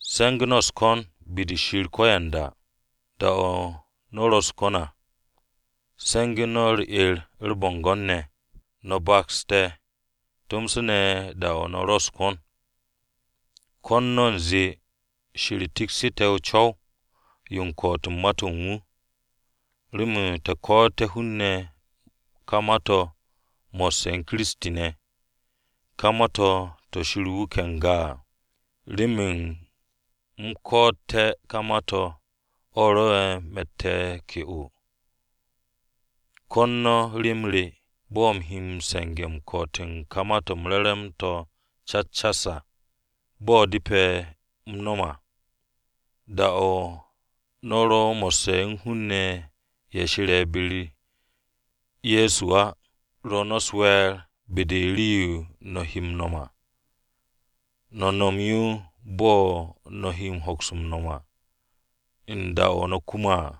Se̱ngu̱ no̱ u̱s-ko̱n be-de Shir ko̱yanda. Da-o̱ no̱ u̱s-ko̱n à, se̱ngu̱ no̱ u̱r-'er u̱r-bo̱ngo̱n ne̱. No̱ baks te̱ tomso ne̱ da-o̱ no̱ ro u̱s-ko̱n. Ko̱n no̱ u̱nze Shir tekse̱ te̱ co̱w-yo u̱n ko̱'o̱t u̱n ma-to̱ u̱n wu̱ à, remen te̱ ko̱'o̱tu̱té̱ hun-ne̱ ka ma-to̱ mo̱sse̱ u̱n Kiristi ne̱, ka ma-to̱ to̱ Shir wuke̱ n-ga à. Remen u̱m ko̱'o̱tte̱ ka ma-to̱ o̱ rwo̱'e̱ me̱tte̱ ke'o. Ko̱n no̱ rem re, bo̱ u̱m he m-se̱nge̱ m-ko̱'o̱t u̱n ka Ma-to̱ m-Re̱re̱m to̱ cas cas à, bo̱ depe̱ u̱m nom à. Da-o̱ no̱ ro mo̱sse̱ u̱n hun-ne̱ ne̱ ye̱ she̱re̱ be-u̱r Ye̱so á, rwo̱ no̱ u̱s-we̱e̱r be-de u̱n rii-yo no̱ he m-nom à. No̱ nom yo bo̱ no̱ he hoks m-nom à u̱n da-o̱ no̱ kume̱ à.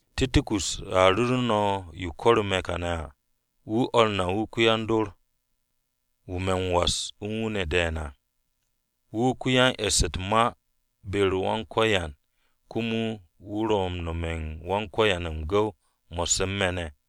Tiko̱ko̱s a ru̱ru̱ no̱ yo ko̱ru̱ me̱ kane̱ à. Wu̱ o̱r na wu̱ ko-yan-dor-wu̱ me̱ m-was u̱n wu̱ ne̱ de̱e̱n à. Wu̱ ko-yan-e̱ss u̱t-ma be-u̱r Wan-Ko̱yan komo wu̱ ro̱ m-nome̱ u̱n Wan-Ko̱yan m-gu̱w mo̱sse̱ u̱n me̱ ne̱.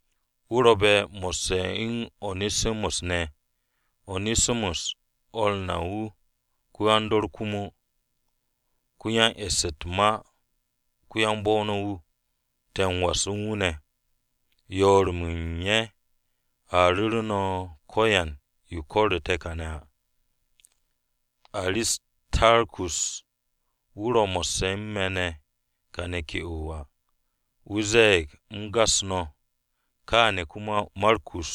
Wu̱ ro̱be̱ mo̱sse̱ u̱n One̱simus ne̱. One̱simus o̱r na wu̱ ko-yan-dor komo, ko-yan-e̱ss u̱t-ma ko-yan-bo̱-o no̱ wu̱, te̱ m-was u̱n wu̱ ne̱. Yoor-mo̱ u̱n ye̱ a ru̱ru̱ no̱ ko̱yan yo ko̱ru̱ te̱ kàne̱ à. Aristarkus, wu̱ ro̱ mo̱sse̱ u̱n me̱ ne̱ kane̱ ke'o à, wu̱ ze̱e̱g u̱m gas no̱. Kaane̱ komo Markus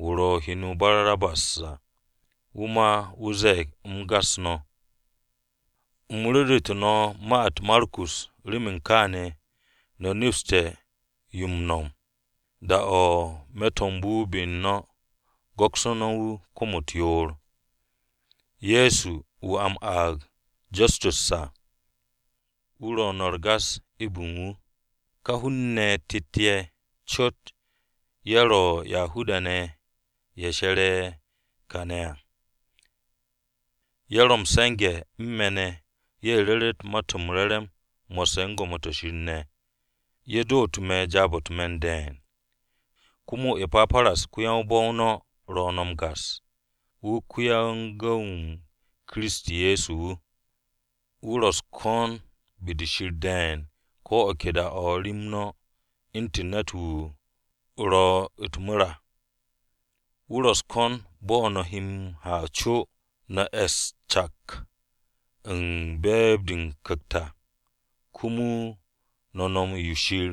wu̱ ro̱ heno Barnabas à wu̱ ma wu̱ ze̱e̱g u̱m gas no̱. (U̱m nomsu̱tu̱ no̱ ma-u̱t Markus remen kaane̱ no̱ nepste̱ yo m-nom, da-o̱ wu̱ wo̱be̱ be-u̱r no̱, go̱ks no̱ wu̱ kom-u̱t yoor.) Ye̱so, wu̱ a m-aag Justus à, ro̱ no̱ m-gas eb u̱n wu̱ ne̱. Ka hun-ne̱ tet-ye̱ cot ye̱ ro̱ Yahuda-ne̱ ye̱ she̱re̱ kane̱ à. Ye̱ ro̱ m-se̱nge̱ u̱n me̱ ne̱ ye̱ ru̱ru̱t Ma-to̱ m-Re̱re̱m mo̱sse̱ u̱n gwo̱mo-to̱ Shir ne̱. Ye̱ dootu̱ me̱ jaab-o̱ u̱t-me̱n de̱e̱n. Komo E̱paparas, ko-yan-bo̱-o no̱ ro̱ no̱ m-gas. Wu̱ ko-yan-gu̱w-m Kiristi Ye̱so wu̱. Wu̱ ro̱ u̱s-ko̱n be-de Shir de̱e̱n ko̱ o̱ ke da-o̱ rem no̱, u̱ntu̱n ne̱t-wu̱ wu̱ ro̱ u̱t-mu̱r à. Wu̱ ro̱ u̱s-ko̱n bo̱ no̱ he m-ha co no̱ es cak u̱n be̱e̱b-de o-Ku̱kt à, komo no̱ nom yo Shir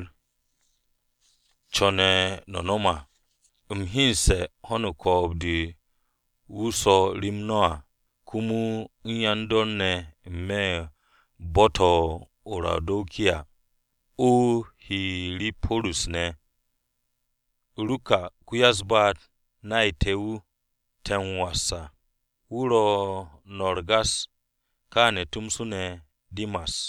co̱ne̱ no̱ nom à. U̱m hyenesse̱ ho̱n u̱n ko̱o̱b-de wu̱ swo̱ rem no̱ à, komo u̱n yan-dor ne̱ n-me̱ u̱n bo̱-to̱ o-Rawudikiya, o-Hiriporis ne̱. Ruka, ko-ya-u̱s-baat, nay te̱, wu̱ te̱ m-was à, wu̱ ro̱ no̱ m-gas, kaane̱ tomso ne̱ Dimas.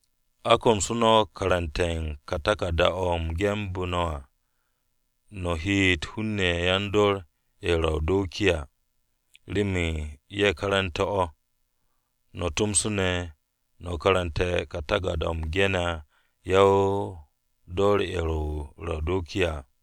A komsu̱ no̱ karante̱ u̱n ka taku̱rda-o̱ u̱m genbu̱ no̱ à, no̱ heete̱ hun-ne̱ yan-dor ye̱ ro̱ o-Rawudikiya, remen ye̱ karantu̱té̱ o̱. No̱ tomso ne̱, no̱ karante̱ taku̱rda-o̱ u̱m gene̱ yan-dor ye̱ o-Rawudikiya à.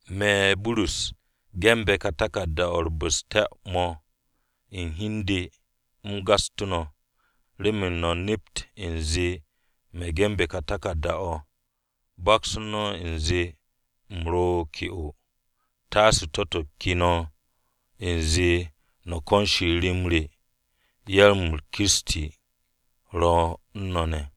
Me̱, Burus, me̱ ge̱nbe̱ ka ge̱n-mo̱ u̱r-bu̱ste̱ mo̱ u̱n hi u̱n de u̱m gastu̱ no̱, remen no̱ nept u̱nze me̱ ge̱nbe̱ ka taku̱rda-o̱. Baks no̱ u̱nze u̱m ro̱ ke'o, taase to̱-to̱ ke no̱ u̱nze no̱ ko̱n Shir rem re. Yar-m Kiristi Ye̱so ro̱ u̱n no̱ ne̱!